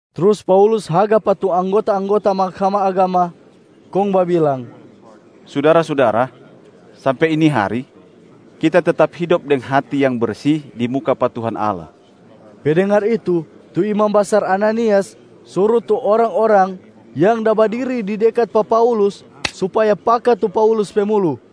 Trus Paulus haga pa tu anggota-anggota Mahkamah Agama kong babilang, “Sudara-sudara, sampe ini hari kita tetap hidop deng hati yang bersi di muka pa Tuhan Allah.” Pe dengar itu, tu imam basar Ananias suru tu orang-orang yang da badiri di dekat pa Paulus supaya paka tu Paulus pe mulu.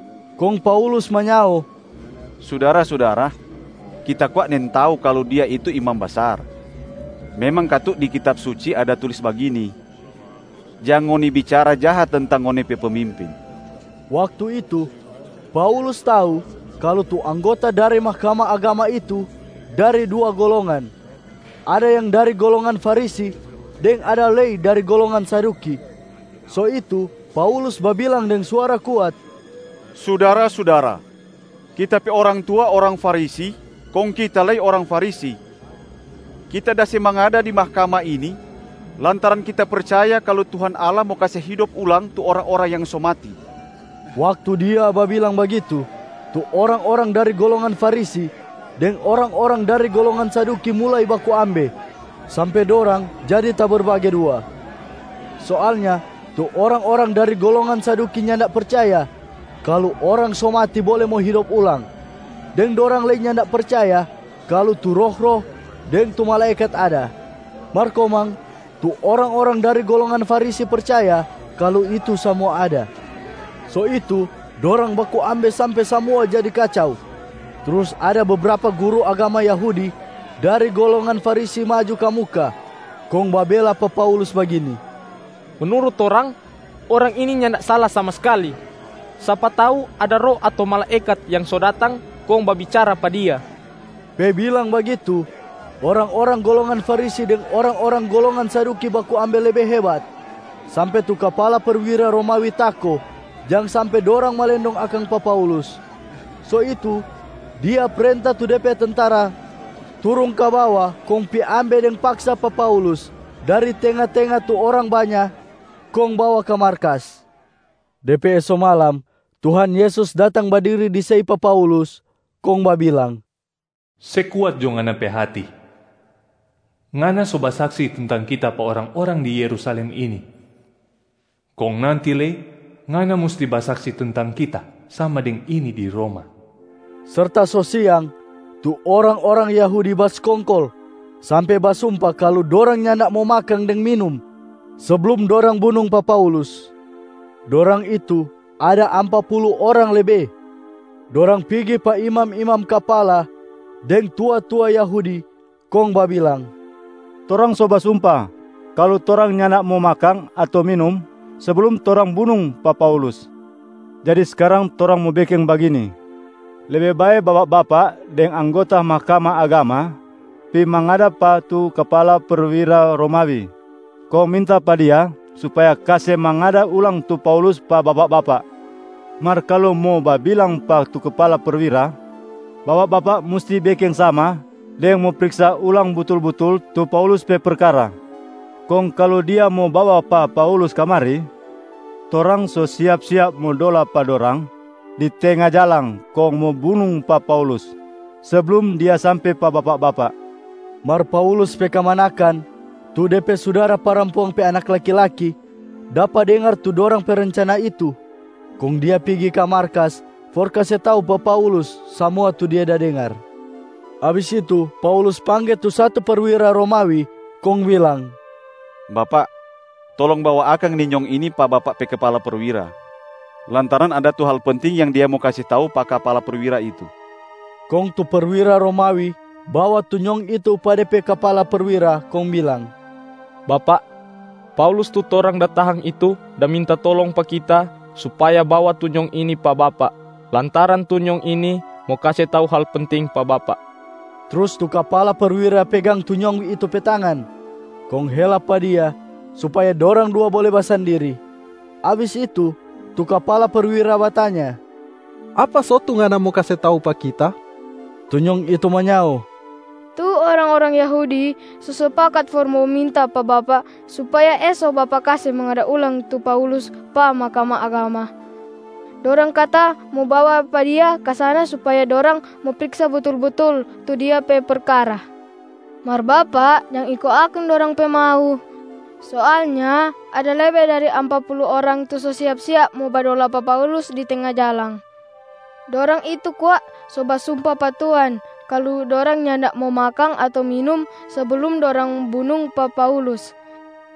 Kong Paulus manyao, “Sudara-sudara, kita kwa nintau kalu dia itu imam basar. Memang katu di Kitab Suci ada tulis bagini, ‘Jang ngoni bicara jaha tentang ngoni pe pemimpin.’” Waktu itu, Paulus tau kalu tu anggota dari Mahkamah Agama itu dari dua golongan, ada yang dari golongan Farisi deng ada lei dari golongan Saduki. So itu Paulus babilang deng suara kuat, “Sudara-sudara, kita pe orang tua orang Farisi kong kita lei orang Farisi. Kita da se mangada di Mahkamah ini lantaran kita percaya kalu Tuhan Allah mo kase hidop ulang tu orang-orang yang so mati.” Waktu dia babilang bagitu, tu orang-orang dari golongan Farisi deng orang-orang dari golongan Saduki mulai baku ambe sampe dorang jadi taberbage dua. Soalnya, tu orang-orang dari golongan Saduki nyanda percaya kalu orang so mati bole mo hidop ulang, deng dorang lei nyanda percaya kalu tu roh-roh deng tu malaekat ada. Mar komang tu orang-orang dari golongan Farisi percaya kalu itu samua ada. So itu dorang baku ambe sampe samua jadi kacau. Trus ada bebrapa guru agama Yahudi dari golongan Farisi maju ka muka kong babela pa Paulus bagini, “Menurut torang, orang ini nyanda sala sama skali! Sapa tau ada roh ato malaekat yang so datang kong babicara pa dia.” Pe bilang bagitu, orang-orang golongan Farisi deng orang-orang golongan Saduki baku ambe lebe hebat, sampe tu kapala perwira Romawi tako jang sampe dorang malendong akang pa Paulus. So itu dia prenta tu de pe tentara turung ka bawa kong pi ambe deng paksa pa Paulus dari tenga-tenga tu orang banya kong bawa ka markas. De pe eso malam, Tuhan Yesus datang badiri di sei pa Paulus kong babilang, “Se kuat jo ngana pe hati! Ngana so basaksi tentang Kita pa orang-orang di Yerusalem ini, kong nanti lei ngana musti basaksi tentang Kita sama deng ini di Roma.” Serta so siang tu orang-orang Yahudi baskongkol sampe basumpa kalu dorang nyanda mo makang deng minum seblum dorang bunung pa Paulus. Dorang itu ada ampa pulu orang lebe. Dorang pigi pa imam-imam kapala deng tua-tua Yahudi kong babilang, “Torang so basumpa kalu torang nyanda mo makang ato minum seblum torang bunung pa Paulus. Jadi skarang torang mo beking bagini: lebe bae bapak-bapak deng anggota Mahkamah Agama pi mangada pa tu kapala perwira Romawi kong minta pa dia supaya kase mangada ulang tu Paulus pa bapak-bapak. Mar kalu mo babilang pa tu kapala perwira, bapak-bapak musti beking sama deng mo priksa ulang butul-butul tu Paulus pe perkara. Kong kalu dia mo bawa pa Paulus kamari, torang so siap-siap mo dola pa dorang di tenga jalang kong mo bunung pa Paulus seblum dia sampe pa bapak-bapak.” Mar Paulus pe kamanakan, tu de pe sudara parampuang pe anak laki-laki, dapa dengar tu dorang pe rencana itu. Kong dia pigi ka markas for kase tau pa Paulus samua tu dia da dengar. Abis itu, Paulus pangge tu satu perwira Romawi kong bilang, “Bapak, tolong bawa akang ni nyong ini pa bapak pe kapala perwira, lantaran ada tu hal penting yang dia mo kase tau pa kapala perwira itu.” Kong tu perwira Romawi bawa tu nyong itu pa de pe kapala perwira kong bilang, “Bapak, Paulus tu torang da tahang itu da minta tolong pa kita supaya bawa tu nyong ini pa bapak, lantaran tu nyong ini mo kase tau hal penting pa bapak.” Trus tu kapala perwira pegang tu nyong itu pe tangan kong hela pa dia supaya dorang dua bole basandiri. Abis itu tu kapala perwira batanya, “Apa so tu ngana mo kase tau pa kita?” Tu nyong itu manyao, “Tu orang-orang Yahudi so spakat for mo minta pa bapak supaya eso bapak kase mangada ulang tu Paulus pa Mahkamah Agama. Dorang kata mo bawa pa dia ka sana supaya dorang mo priksa butul-butul tu dia pe perkara. Mar bapak jang iko akang dorang pe mau. Soalnya ada lebe dari ampa pulu orang tu so siap-siap mo badola pa Paulus di tenga jalang. Dorang itu kwa so basumpa pa Tuhan kalu dorang nyanda mo makang ato minum seblum dorang bunung pa Paulus.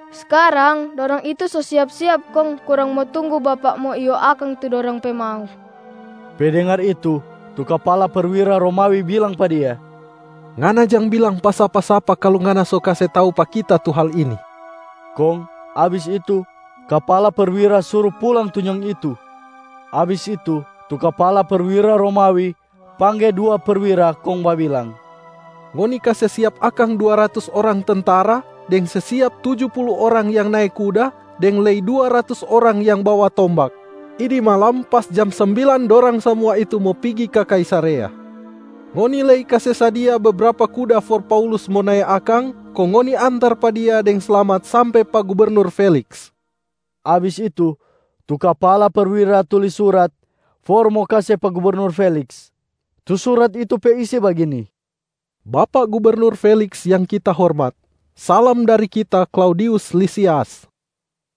Skarang dorang itu so siap-siap kong kurang mo tunggu bapak mo iyo akang tu dorang pe mau.” Pe dengar itu, tu kapala perwira Romawi bilang pa dia, “Ngana jang bilang pa sapa-sapa kalu ngana so kase tau pa kita tu hal ini.” Kong abis itu kapala perwira suru pulang tu nyong itu. Abis itu, tu kapala perwira Romawi pangge dua perwira kong babilang, “Ngoni kase siap akang dua ratus orang tentara, deng se siap tuju pulu orang yang nae kuda, deng lei dua ratus orang yang bawa tombak. Ini malam pas jam sambilan dorang samua itu mo pigi ka Kaisarea. Ngoni lei kase sadia bebrapa kuda for Paulus mo nae akang, kong ngoni antar pa dia deng slamat sampe pa Gubernur Feliks.” Abis itu, tu kapala perwira tulis surat for mo kase pa Gubernur Feliks. Tu surat itu pe isi bagini, “Bapak Gubernur Feliks yang kita hormat. Salam dari kita, Klaudius Lisias.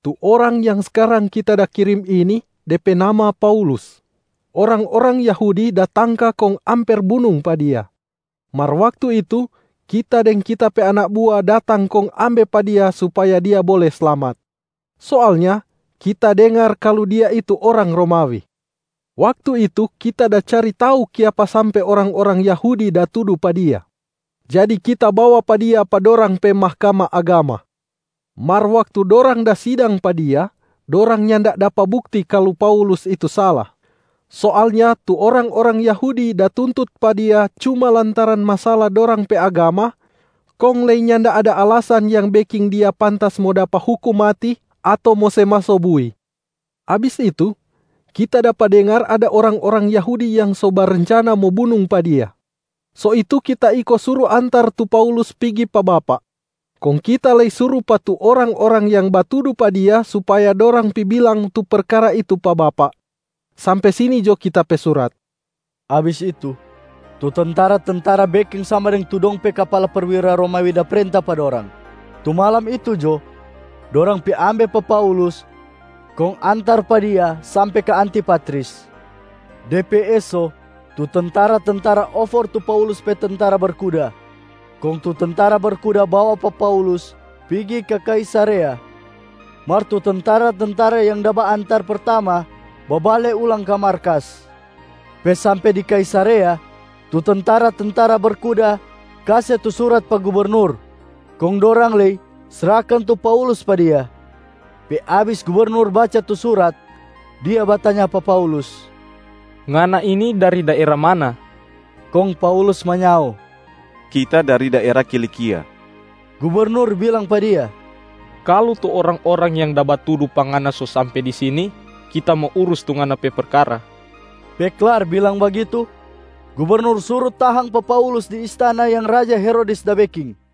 Tu orang yang skarang kita da kirim ini, de pe nama Paulus. Orang-orang Yahudi da tangka kong amper bunung pa dia. Mar waktu itu, kita deng kita pe anak bua datang kong ambe pa dia supaya dia bole slamat. Soalnya, kita dengar kalu dia itu orang Romawi. Waktu itu kita da cari tau kiapa sampe orang-orang Yahudi da tudu pa dia. Jadi kita bawa pa dia pa dorang pe Mahkamah Agama. Mar waktu dorang da sidang pa dia, dorang nyanda dapa bukti kalu Paulus itu sala. Soalnya tu orang-orang Yahudi da tuntut pa dia cuma lantaran masala dorang pe agama, kong lei nyanda ada alasan yang beking dia pantas mo dapa hukum mati ato mo se maso bui. Abis itu, kita dapa dengar ada orang-orang Yahudi yang so barencana mo bunung pa dia. So itu kita iko suru antar tu Paulus pigi pa bapak. Kong kita lei suru pa tu orang-orang yang batudu pa dia supaya dorang pi bilang tu perkara itu pa bapak. Sampe sini jo kita pe surat.” Abis itu, tu tentara-tentara beking sama deng tu dong pe kapala perwira Romawi da prenta pa dorang. Tu malam itu jo, dorang pi ambe pa Paulus kong antar pa dia sampe ka Antipatris. De pe eso, tu tentara-tentara ofor tu Paulus pa tentara berkuda, kong tu tentara berkuda bawa pa Paulus pigi ka Kaisarea, mar tu tentara-tentara yang da baantar pertama babale ulang ka markas. Pe sampe di Kaisarea, tu tentara-tentara berkuda kase tu surat pa Gubernur, kong dorang lei srahkan tu Paulus pa dia. Pe abis Gubernur baca tu surat, dia batanya pa Paulus, “Ngana ini dari daera mana?” Kong Paulus manyao, “Kita dari daera Kilikia.” Gubernur bilang pa dia, “Kalu tu orang-orang yang da batudu pa ngana so sampe di sini, kita mo urus tu ngana pe perkara.” Pe klar bilang bagitu, Gubernur suru tahang pa Paulus di istana yang raja Herodes da beking.